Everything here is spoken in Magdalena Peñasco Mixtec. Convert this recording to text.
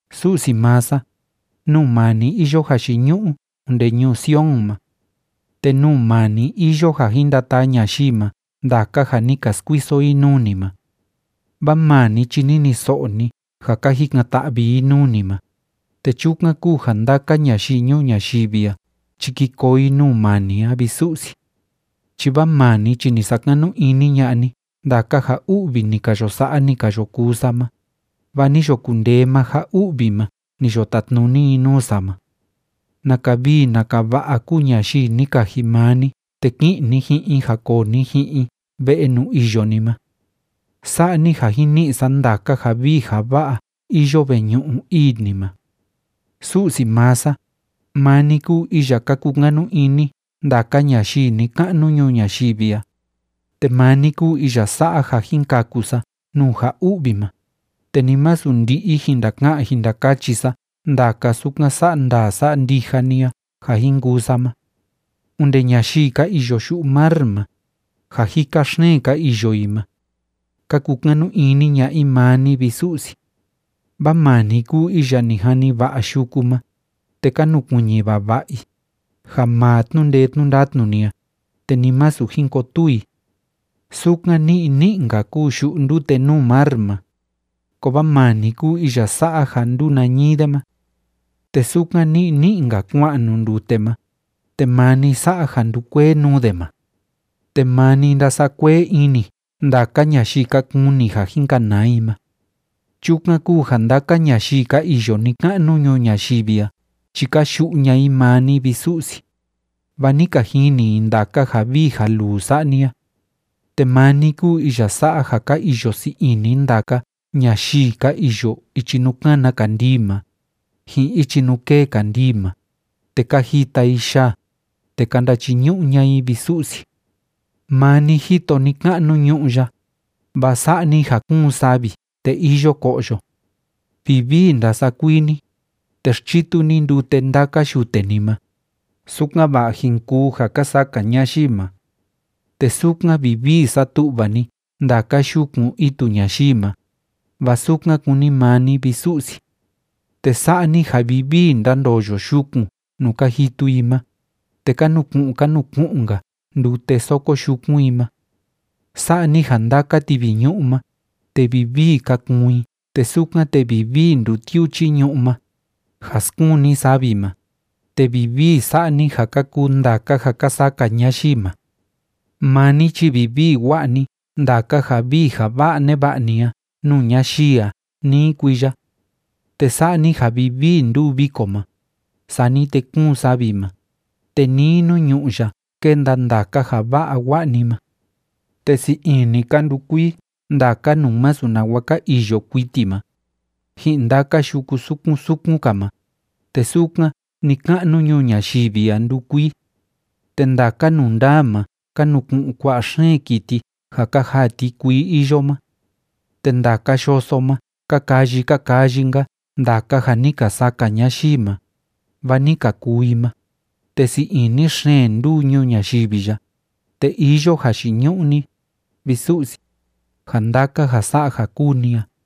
Su'si maa sa, nuu maa ni iyo jayiñu'u onde ñuu Sion ma. Te nuu maa ni iyo ja jin ndataa ñayii ma ndaka ja ni ka skuiso i nuu ni ma. Vaa maa ni chi niniso'o ni ja ka jikan‑ta'vi i nuu ni ma, te chukan kúu ja ndaka ñayii ñuu ñayivi a chi ki koo i nuu maa ni a, vi Su'si. Chi vaa maa ni chi ni sakanu ini ña'a ni ndaka ja u'vi ni ka yo sa'a, ni ka yo kuu sa ma, vaa ni yo kundee maa ja u'vi ma ni yo tatnuni i nuu sa ma. ¡Naka vii naka va'a kúu ñayii ni kaji maa ni te ki'in ni ji'in i ja koo ni ji'in i ve'e nuu iyo ni ma! Sa'a ni ja jin ni'i sa ndaka ja vii ja va'a iyo veñu'u ii ni ma. Su'si maa sa, maa ni kúu iya ka kukanu ini ndaka ñayii ni‑ka'nu ñuu ñayivi a, te maa ni kúu iya sa'a ja jin kaku sa nuu ja u'vi ma, te ni masu ndi'i jin ndaka'an jin ndakachi sa ndaka sukan sa'a ndaa sa'a ndija ni a ja jin kuu sa ma. Onde ñayii ka iyo yu'u mar ma, ja jika xeen ka iyo i ma, ka kukanu ini ña'a i maa ni, vi Su'si. Vaa maa ni kúu iya ni jani va'a yuku ma, te ka nukuiñi vava'a i, ja maa tnu'u ndee tnu'u ndatnu ni a, te ni masu jin kotuu i. Sukan ni'i ni'i‑nka kúu yu'u ndute nuu mar ma, kovaa maa ni kúu iya sa'a ja ndúu nañii de ma. Te sukan ni'i ni'i‑nka kua'an nuu ndute ma, te maa ni sa'a ja ndúkuee nuu de ma. Te maa ni ndása'a kuee ini ndaka ñayii ka kuni ja jin kanaa i ma. Chukan kúu ja ndaka ñayii ka iyo ni‑ka'nu ñuu ñayivi a chi ka yu'u ña'a i maa ni, vi Su'si, vaa ni ka jini i ndaka ja vii ja luu sa'a ni a. Te maa ni kúu iya sa'a ja ka iyo sii ini ndaka ñayii ka iyo ichi nuu kána kandii ma, ji'in ichi nuu kêe kandii ma, te ka jita i yaa, te ka ndachiñu'u ña'a i, vi Su'si. Maa ni jito ni‑ka'nu ñu'ú ya, vaa sa'a ni ja kúun savi te iyo ko'yo. Vivii ndása'a kuii ni, te xchitu ni ndute ndaka yute ni ma, sukan‑va'a jin kuu ja ka saka ñayii ma. Te sukan vivii satu'va ni ndaka yukun itu ñayii ma, vaa sukan kúni maa ni, vi Su'si. Te sa'a ni ja vivii ndándoyo yukun nuu ka jitu i ma, te ka nuku'un ka nuku'un‑nka ndute soko yukun i ma. Sa'a ni ja ndaka tiviñu'u ma, te vivii ka kuun i te sukan te vivii ndutiuchi ñu'ú ma, ja skuun ni savi ma, te vivii sa'a ni ja ka kuu ndaka ja ka saka ñayii ma. Maa ni chi vivii wa'a ni ndaka ja vii ja va'a neva'a ni a nuu ñayii a nii kuiya. Te sa'a ni ja vivii ndúu viko ma, sani te kúun savi ma, te nii nuu ñu'ú ya kénda ndaka ja va'a wa'a ni ma. Te sii ini ka ndukuii ndaka nuu masu nawa ka iyo kuiti ma, ji'in ndaka yuku sukun sukun‑ka ma, te sukan ni‑ka'nu ñuu ñayivi a ndúkuii. Te ndaka nundaa ma ka nuku'un kua'a xeen kiti ja ka jaa ti kuii iyo ma. Te ndaka yoso ma ka kayi ka kayi‑nka ndaka ja ni ka saka ñayii ma, vaa ni ka kuu i ma, te sii ini xeen ndúu ñuu ñayivi ya, te iyo jayiñu'u ni, vi Su'si, ja ndaka ja sa'a ja kúu ni a.